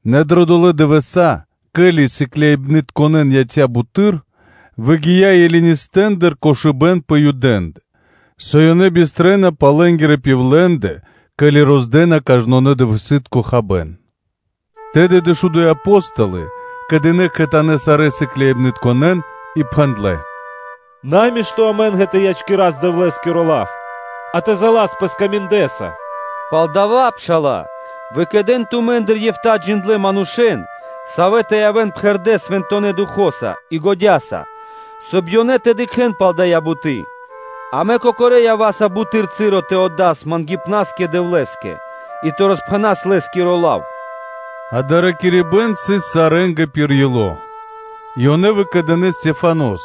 Нэ дрэ долэ́ дывэса́, ке́ли сыкляибны́тка ячнэ́ буты́р, выгия́ Елинистэндыр холямо́ ракирибэ́н пэ Юдэ́ндэ, со ёнэ бистрэна пал лэ́нгирэ пивлендэ (удовэндэ), ке́ли роздэна кажнонэ́-дывэсы́тко хабэ́н. Тэды дэшуду́й Апо́столы кэдынэ кхэтанэ́ сарэ́н сыкляибнытконэ́н и пхэндлэ́: “Намишто амэ́нгэ тэ ячкирас Дэвлэ́скиро лав, а тэ заласпэ скаминдэса. Палдава́, пшала́лэ, выкэдэн тумэ́ндыр эфта́ джиндлэ́ манушэ́н, савэ́ тэ явэ́н пхэрдэ́ Свэнтонэ́ Духо́са и годя́са, соб (кай) лэ́нгэ и тэ дыкхэ́н пал дая́ буты́; амэ кокорэ́ ява́са буты́р часо тэ отдас мангипнаскэ Дэвлэ́скэ и тэ роспхэнас Лэ́скиро лав.” Дасаво ракирибэ́н сыс сарэ́нгэ пир ило́; и ёнэ выкэдынэ́ Стехванос (Стефанос),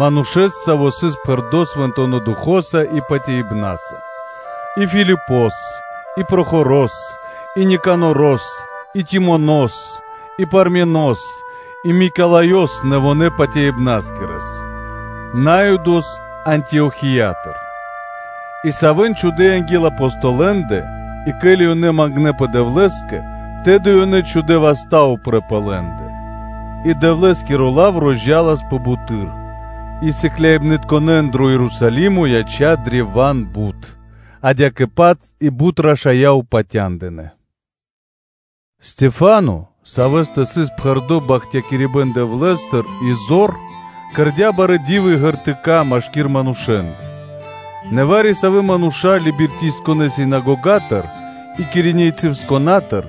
манушэ́с, саво́ сыс пхэрдо́ Свэнтонэ́ Духо́са и патяибна́са и Филипос, и Прохорос, и Никанорос, и Тимонос, и Парменос, и Микалаёс (Николаёс), нэвонэ́-патяибнаскирэс, Наюдос Антиохиятыр, и савэ́н чхудэ́ анги́л Апостолэндэ, и ке́ли ёнэ мангнэпэ Дэвлэ́скэ, тэды ёнэ чхудэ́ васта́ упрэ́ пэ лэ́ндэ. И Дэвлэ́скиро лав розджаласпэ буты́р, и сыкляибны́тка дро Ерусалимо ячнэ́ древа́н бут, адя́кэ-паць и бут рашая́ упатя́ндынэ. Стехвано (Стефано), савэ́стэ сыс пхэрдо́ бахтякирибэ́н Дэвлэ́стыр и зор, кэрдя́ барэ́ ди́вы и знаме́нии (ґертыка́) машки́р манушэ́ндэ. Нэ вари-савэ́ мануша́ Либертийцынэнгирэ синагогатыр, и Киринейцынэнгирьятыр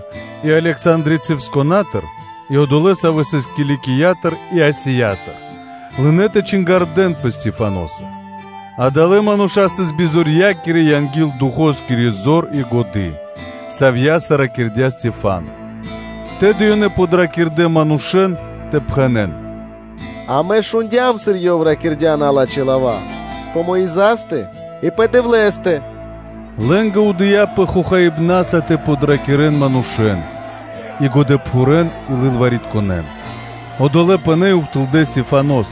и Александрийцынэнгирьятыр, и одолэ́, савэ́ сыс Киликиятыр и Асиятыр, лынэ́ тэ допхэнэн Стехваноскэ. Адалэ́ мануша́ сыс бизорья́кирэ анги́л Духоскири зор и годы́, савья́са ракирдя́ Стехвано. Тэды ёнэ подракирдэ манушэ́н тэ пхэнэ́н: “Амэ шундя́м, сыр ёв ракирдя́ налачхэ́ лава́ пэ Мойзастэ и пэ Дэвлэ́стэ.” Лэ́нгэ удыяпэ хохаибнаса тэ подракирэн манушэ́н и годэпхурэн и лылваритконэн. Одолэ́ пынэ́ и ухтылдэ́ Стехванос,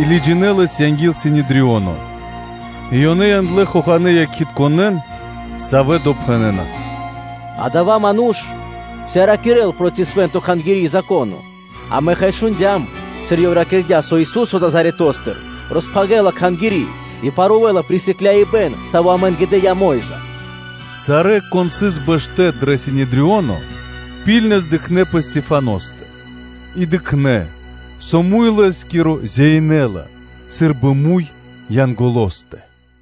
и лыджинэ́ лэс анги́л Синедрионо. И ёнэ яндлэ́ хоханэ́ якхитконэн, савэ́ допхэнэнас: “Адава́ ману́ш уса́ ракирэ́ла проти Свэ́нто Кхангири́ и Зако́но; амэ, хай, шундя́м, сыр ёв ракирдя́, со Ису́со Назаретостыр роспхагирэла Кхангири́ и парувэла присыкляибэн, саво́ амэ́нгэ дыя́ Мо́йза.” Сарэ́, кон сыс бэшто́ дрэ Синедрионо, ракхунэс дыкхнэ́ пэ Стехваностэ, и дыкхнэ́, со муй лэ́скиро зяинэла сы́рбы муй Янголостэ.